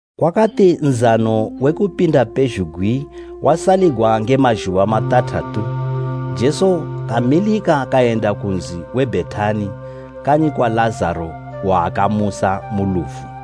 Kwakati Nzano we Kupinda pezhugwi wasaligwa nge mazhuba matathatu, Jesu kamilika kayenda ku nzi we Bhetani kanyi kwa Lazaro waakamusa mu lufu.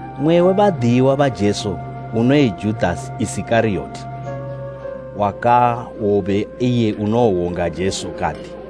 Mmwe we badiyiwa ba Jesu, unoyi Judasi Isikariyoti wakawobe iye unowo wonga Jesu kati,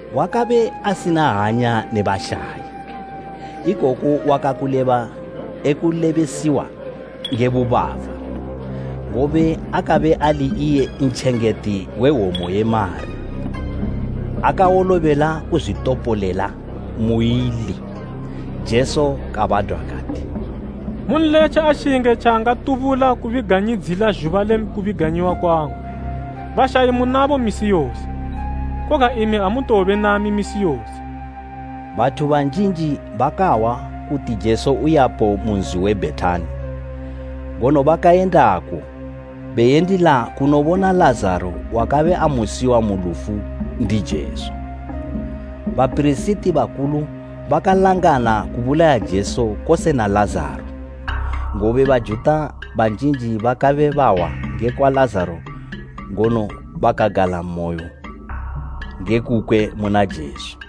Wakabe asina hanya ne bashayi, ikoku wakabe e kulebesiwa nge bubava, ngobe akabe ali iye ntjengeti we hwomo ye mari, akawolobela kuzwitopolela muili. Jesu kabadwa kati, “Munletje ashinge tjaangatubula kubiganyidzila zhuba le kubiganyiwa kwangu. Bashayi munabo misi yose. Koga imi amutowobe nami misi yose.” Bathu banjinji bakahwa kuti Jesu uyapo mu nzi we Bhetani, ngono bakayendako beyendila kunobona Lazaro wakabe amusiwa mu lufu ndi Jesu. Bapirisiti bakulu bakalangana kubulaya Jesu kose na Lazaro, ngobe Bajuta banjinji bakabe bahwa ngekwa Lazaro ngono bakagalamoyo nge kukwe muna Jesu.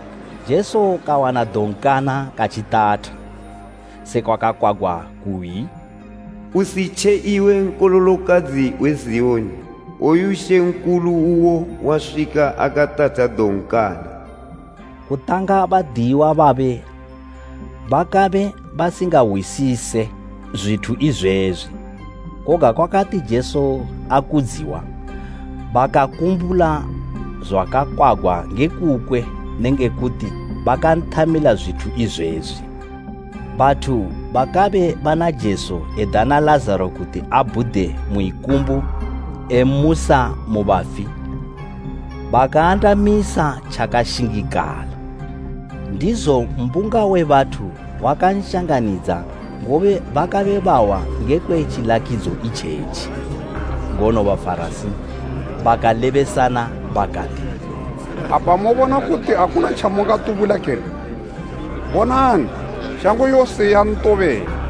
Jesu kawana donkana katjitatha, sekwa kwakakwagwa kuyi, “Usitje, iwe nkololokadzi we Ziyoni! Woyu Mambo uwo waswika akatatha donkana.” Kutanga badiyiwa babe bakabe basingahwisise zwithu izwezwi, koga kwakati Jesu akudziwa, bakakumbula zwakakwagwa nge kukwe nenge kuti bakanthamila zwithu izwezwi. Bathu bakabe bana Jesu edana Lazaro kuti abhude mu ikumbu emmusa mu bafi, bakaandamisa tjakashingikala. Ndizo mbunga we bathu wakanshanganidza, ngobe bakabe bahwa ngekwe tjilakidzo itjetji. Ngono Bafarasi bakalebesana bakati, “Apa mobona kuti akuna tjamungatubula kene? Bonani, shango yose yantobela!”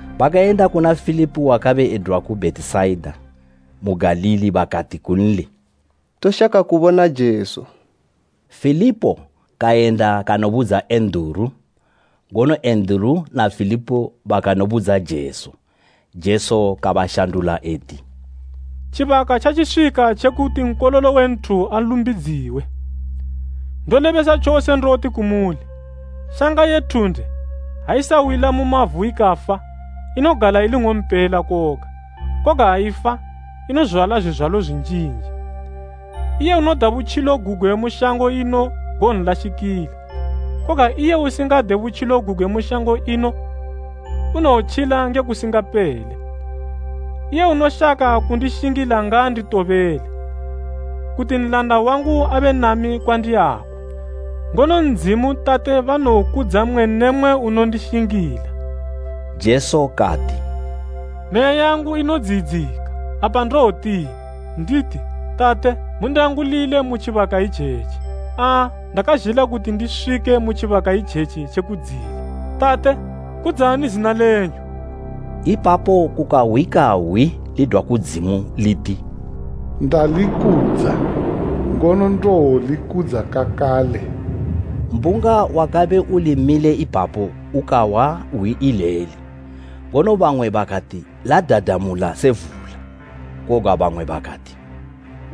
Bakayenda kuna Filipo wakabe edwa ku Bhetisaida mu Galili bakati kunli, “Toshaka kubona Jesu.” Filipo kayenda kanobudza Enduru, ngono Enduru na Filipo bakanobudza Jesu. Jesu kabashandula eti, “Tjibaka tjatjiswika tje kuti Nkololo we nthu alumbidziwe. Ndolebesa tjose ndoti kumuli, shanga ye thunde, ha isawila mu mavu ikafa, inogala ili ing'ompela koga; koga ha ifa, inozwala zwizwalo zwinjinji. Iye unoda butjilo gugwe mu shango ino gowonlashikila, koga iye usingade butjilo gugwe mu shango ino, unowotjila nge kusingapele. Iye unoshaka kundishingila ngaanditobele, kuti nlanda wangu abe nami kwandiyako. Ngono Ndzimu, Tate banowokudza mmwe ne mmwe unondishingila.” Jesu kati, “Meya yangu inodziyidzika, apa ndowotini? Nditi, ‘Tate, mundiangulile mu tjibaka itjetji?’ Aa, ndakazhila kuti ndiswike mu tjibaka itjetji tje kudziyila. Tate, kudzani zina lenyu!” Ipapo kukahwika hwi lidwa kudzimu liti, “Ndalikudza, ngono ndowolikudza kakale.” Mbunga wakabe uli mile ipapo ukahwa hwi ileli, ngono bamwe bakati ladadamula se vula, koga bamwe bakati,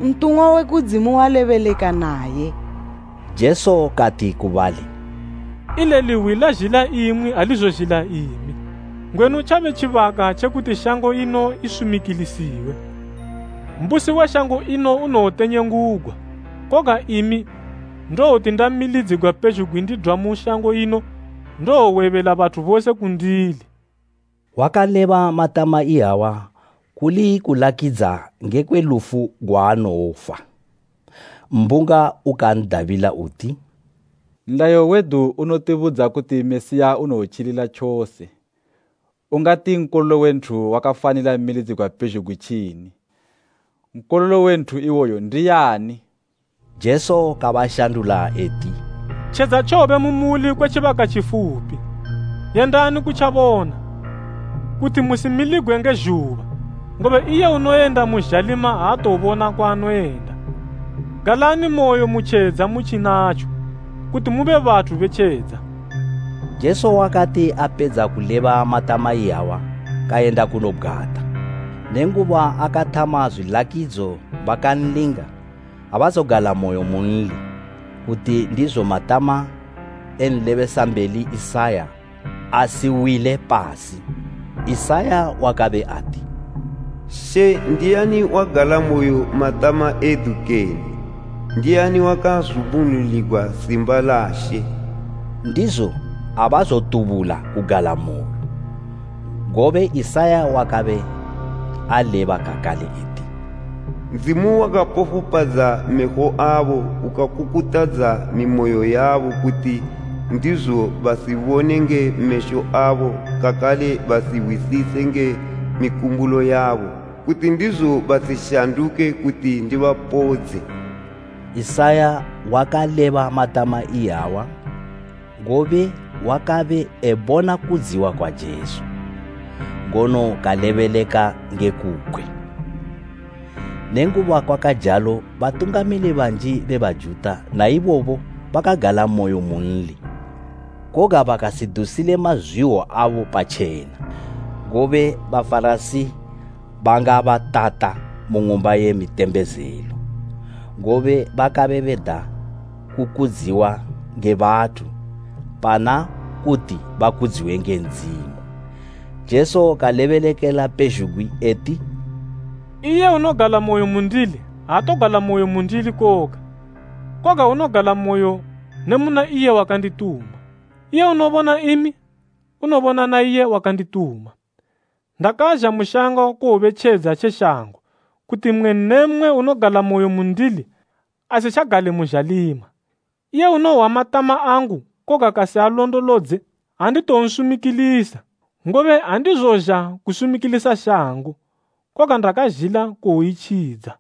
“Ntumwa we kudzimu walebeleka naye!” Jesu kati ku bali, “Ileli hwi lazhila imwi alizozhila imi. Ngwenu tjabe tjibaka tje kuti shango ino isumikilisiwe. Mbusi we shango ino unowotenyengugwa. Koga imi, ndowoti ndamilidzigwa pezhugwi ndidwa mu shango ino, ndowowebela bathu bose kundili.” Wakaleba matama iyawa kuli kulakidza ngekwe lufu gwaanowofa. Mbunga ukan'dabila uti, “Nlayo wedu unotibudza kuti Mesiya unowotjilila tjose. Ungati Nkololo we nthu wakafanila milidzigwa pezhugwi tjini? Nkololo we nthu iwoyo ndiyani?” Jesu kabashandula eti, “Tjedza tjowobe mu muli kwe tjibaka tjifupi. Yendani kutjabona, kuti musimiligwe nge zhuba, ngobe iye unoyenda mu zhalima aatobona kwaanoyenda. Galanimoyo mu tjedza mutjinatjo, kuti mube bathu be tjedza.” Jesu wakati apedza kuleba matama iyawa kayenda kanobgwata. Nenguba akathama zwilakidzo bakanlinga, abazogalamoyo munli, kuti ndizo matama e nlebesambeli Isaya asiwile pasi, Isaya wakabe ati, “She, ndiani wagalamoyo matama edu kene? Ndiani wakazumbunuligwa simba la She?” Ndizo abazotubula kugalamoyo, ngobe Isaya wakabe aleba kakale eti, “Ndzimu wakapofupadza mesho abo, ukakukutadza mimoyo yabo, kuti ndizo basibone nge mesho abo, kakale basihwisise nge mikumbulo yabo, kuti ndizo basishanduke kuti ndibapodze.” Isaya wakaleba matama iyawa, ngobe wakabe ebona kudziwa kwa Jesu, ngono kalebeleka nge kukwe. Nenguba kwakajalo batungamili banji be Bajuta naibobo bakagalamoyo munli, koga bakasidusile mazwiwo abo patjena, ngobe Bafarasi bangabatata mu ng'umba ye mitembezelo, ngobe bakabe beda kukudziwa nge bathu pana kuti bakudziwe nge Ndzimu. Jesu kalebelekela pezhugwi eti, “Iye unogalamoyo mundili aatogalamoyo mundili koga, koga unogalamoyo ne muna iye wakandituma. Iye unobona imi unobona na iye wakandituma. Ndakazha mu shango kuwobe tjedza tje shango kuti mmwe ne mmwe unogalamoyo mundili asitjagale mu zhalima. Iye unohwa matama angu koga kasialondolodze, anditowonsumikilisa. Ngobe andizozha kusumikilisa shango, koga ndakazhila kuwoitjidza.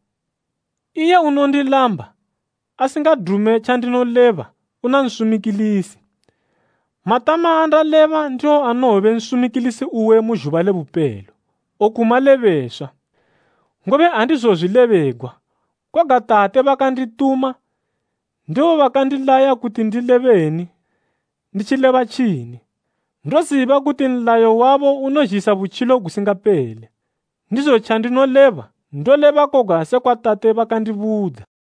Iye unondilamba, asingadume tjandinoleba una Nsumikilisi. Matama andaleba ndiwo anowobe nsumikilisi uwe mu zhuba le bupelo. Oku malebeswa, ngobe andizozwilebegwa, koga Tate bakandituma ndibo bakandilaya kuti ndilebeni nditjileba tjini. Ndoziba kuti nlayo wabo unozhisa butjilo gusingapele. Ndizo tjandinoleba, ndoleba koga sekwa Tate bakandibudza.”